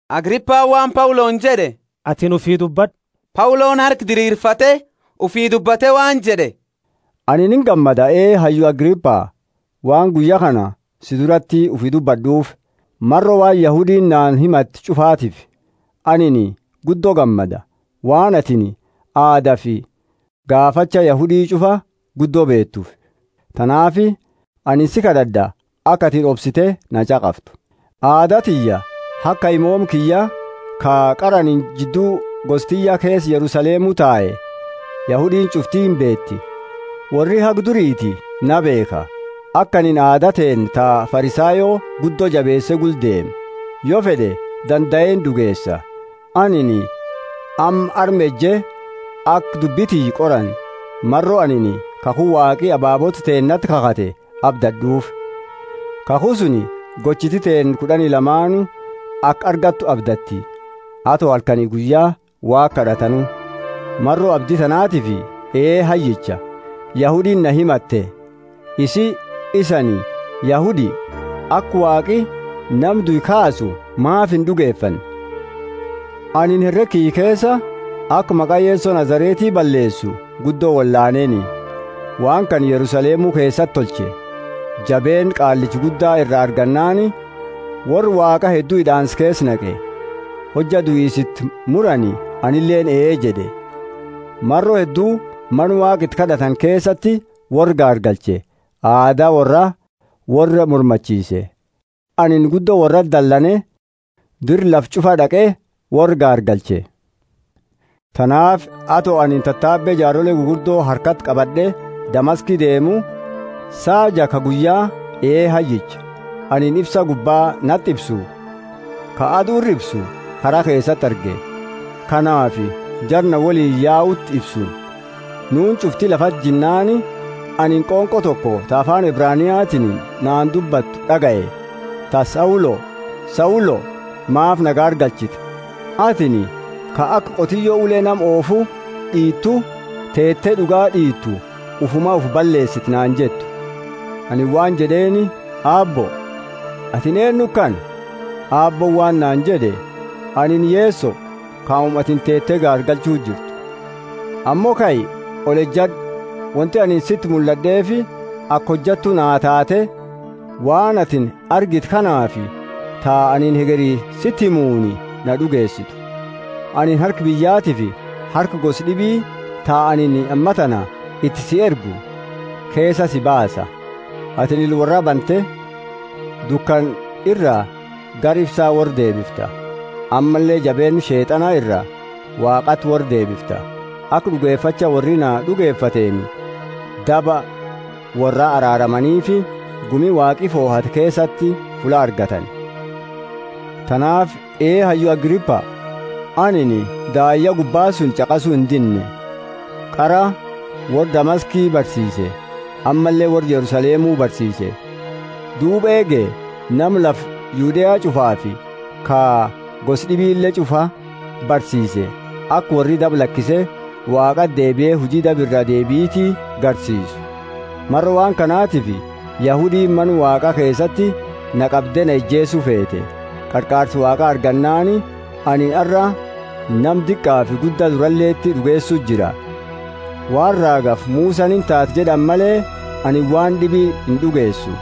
Agripani waan Pauloni jed'e, Atini ufii dubbad'u. Pauloni harka dirirfate ufii dubbate waan jed'e: Anini ingammada, ee hayyu Agripa waan guyya kana si durati ufii dubbad'uufi; maro waan Yahudiini naani himate ch'ufatiifi. Anini guddo gammada, waan atini aadafi gaafacha Yahudi ch'ufa guddo beetuufi. Tanaafi anini si kad'ad'a, aka atini obsite na ch'aqaftu. Aada tiyya, haga kaimooma kiyya, ka qara anini jiddu gosa tiyya keesa Yerusalemu tae, Yahudiini ch'ufti imbeeti. Worri haga duriiti na beekha, aka anini aada teenna ta Farisayo guddo jabeese gula deeme yo fed'e dandae ind'ugeesa. Anini amma arma eje aka dubbi tiyya qorani maro anini kakhu Waaqi ababoota teennati kakhate abdad'uufi kakhu suni gochiti teenna kud'ani lamaanu aka argatani abdatti, ato halkani guyya Waaqa kad'atanu. Maro abdi tanaatiifi, ee hayyicha, Yahudiini na himatte. Isii, isani Yahudi, aka Waaqi nama due kaasu maafi ind'ugefanne? Anini herega kiyya keesa, aka maqa Yeso Nazareti balleesu guddo wolaaneeni. Waan kana Yerusalemu keesati tolche. Jabeenna Qaallicha Gudda ira argannaani, worra Waaqaa heddu hid'aansa keesa naqe; hojja duisa iti murani anileeni ee jed'e. Maro heddu mana Waaqa iti kad'atani keesati worra gaargalche, aada worraa worra mormachiise. Anini guddo worrati dalane dira lafa ch'ufa d'aqe, worra gaargalche. Tanaafi ato anini tatabe jaarole gugurdo harkati qabad'e Damaski deemu, saa jaa ka guyya, ee hayyicha, anini ifsa gubba nati ifsu, ka adu ira ifsu, kara keesati arge, ka naafi jara na woliini yauti ifsu. Nuuni ch'ufti lafati jinnaani anini qonqo toko ta afaani Ebraniatiini naani dubbatu d'agaye, ta Saulo, Saulo maafa na gaargalchita? Atini ka aka qotiyo ule nama oofu d'iitu, teete, d'ugaa d'iitu ufuma ufi balleesita naani jettu. Anini waan jed'eeni, Aabbo, atini eennu kana? Aabbooni waan naani jed'e. Anini Yeso kauma atini gaargalchu jirtu. Ammo kai, olejad'u. Wonti anini siti mullad'eefi aka hojattu naa taate waan atini argite kanaafi ta anini hegeri siti himuni na d'ugeesitu. Anini harka biyyatiifi harka gosa d'ibi, ta anini ammatana iti si ergu, keesaa si baasa. Atini ila worraa bante, dukana ira gara ifsa worra deebifta, ammalle jabeenna Sheet'ana iraa Waaqati worra deebifta; aka d'ugefacha worri na d'ugefateeni daba worraa araaramaniifi, gumi Waaqi fohate keesati fulla argatani. Tanaafi, ee hayyu Agripa, anini daayya gubba suni ch'aqasu indinne. Qara worra Damaski barsiise, ammalle worra Yerusalemu barsiise, duuba eege nama lafa Yudea ch'ufaafi ka gosa d'ibile ch'ufa barsiise aka worri daba lakise Waaqati deebie huji daba iraa deebiti garsiisu. Maro waan kanatifi Yahudiini Mana Waaqa keesati na qabde na ijeesu feete. Qarqaarsa Waaqa argannaani anini arra nama diqaafi gudda duraleti d'ugeesu jira, waan raagafi Musani, Intaati jed'ani male, anini waan d'ibi ind'ugeesu: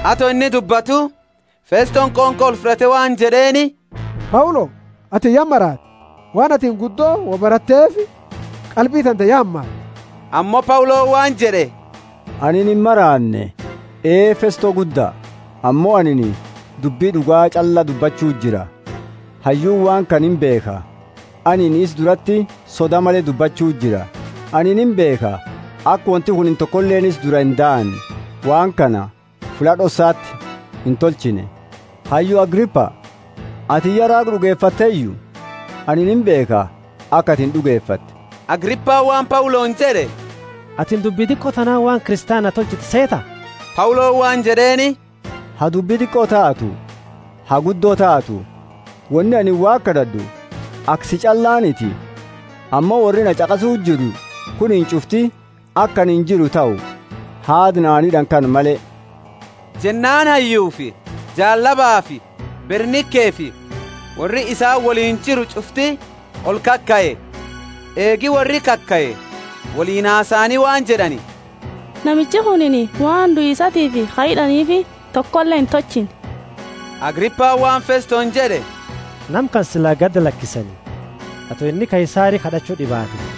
Ato inni dubbatu, Festoni qonqo olfud'ate waan jed'eeni, Paulo, atini ya maraate; waan atini guddo wo baratteefi qalbiini tante ya hamaatte. Ammo Pauloni waan jed'e, Anini imaraanne, ee Festo gudda, ammo anini dubbi d'uga ch'alla dubbachuu jira. Hayyuuni waan kana imbeekha, anini isa durati soda male dubbachu jira. Anini imbeekha, aka wonti kunini tokoleeni isa dura indahanne; waan kana fulla d'ossati intolchine. Hayyu Agripa, atini ya raaga d'ugefatteyu? Anini imbeekha, aka atini d'ugefatte. Agripani waan Pauloni jed'e, Atini dubbi diqo tanaani waan Kristiana na tolchitu seeta? Pauloni waan jed'eeni, Ha dubbi diqo taatu, ha guddo taatu, woni anini Waaqa kad'ad'u, aka si ch'allaaniti, ammo worri na ch'aqasu jiru kunini ch'ufti, aka anini jiru tahu, haada naani hid'ani kana male. Jennaani hayyufi jaallabafi Bernikefi worri isaani woliini jiru ch'ufti olkakae. Eegi worri kakae, woliini hasaani waan jed'ani, Namichi kunini waan duisatiifi ka hid'aniifi tokole intolchine. Agripani waan Festoni jed'e, Nama kana sila gadi lakisani, ato inni Kaisari kad'achu d'ibaate.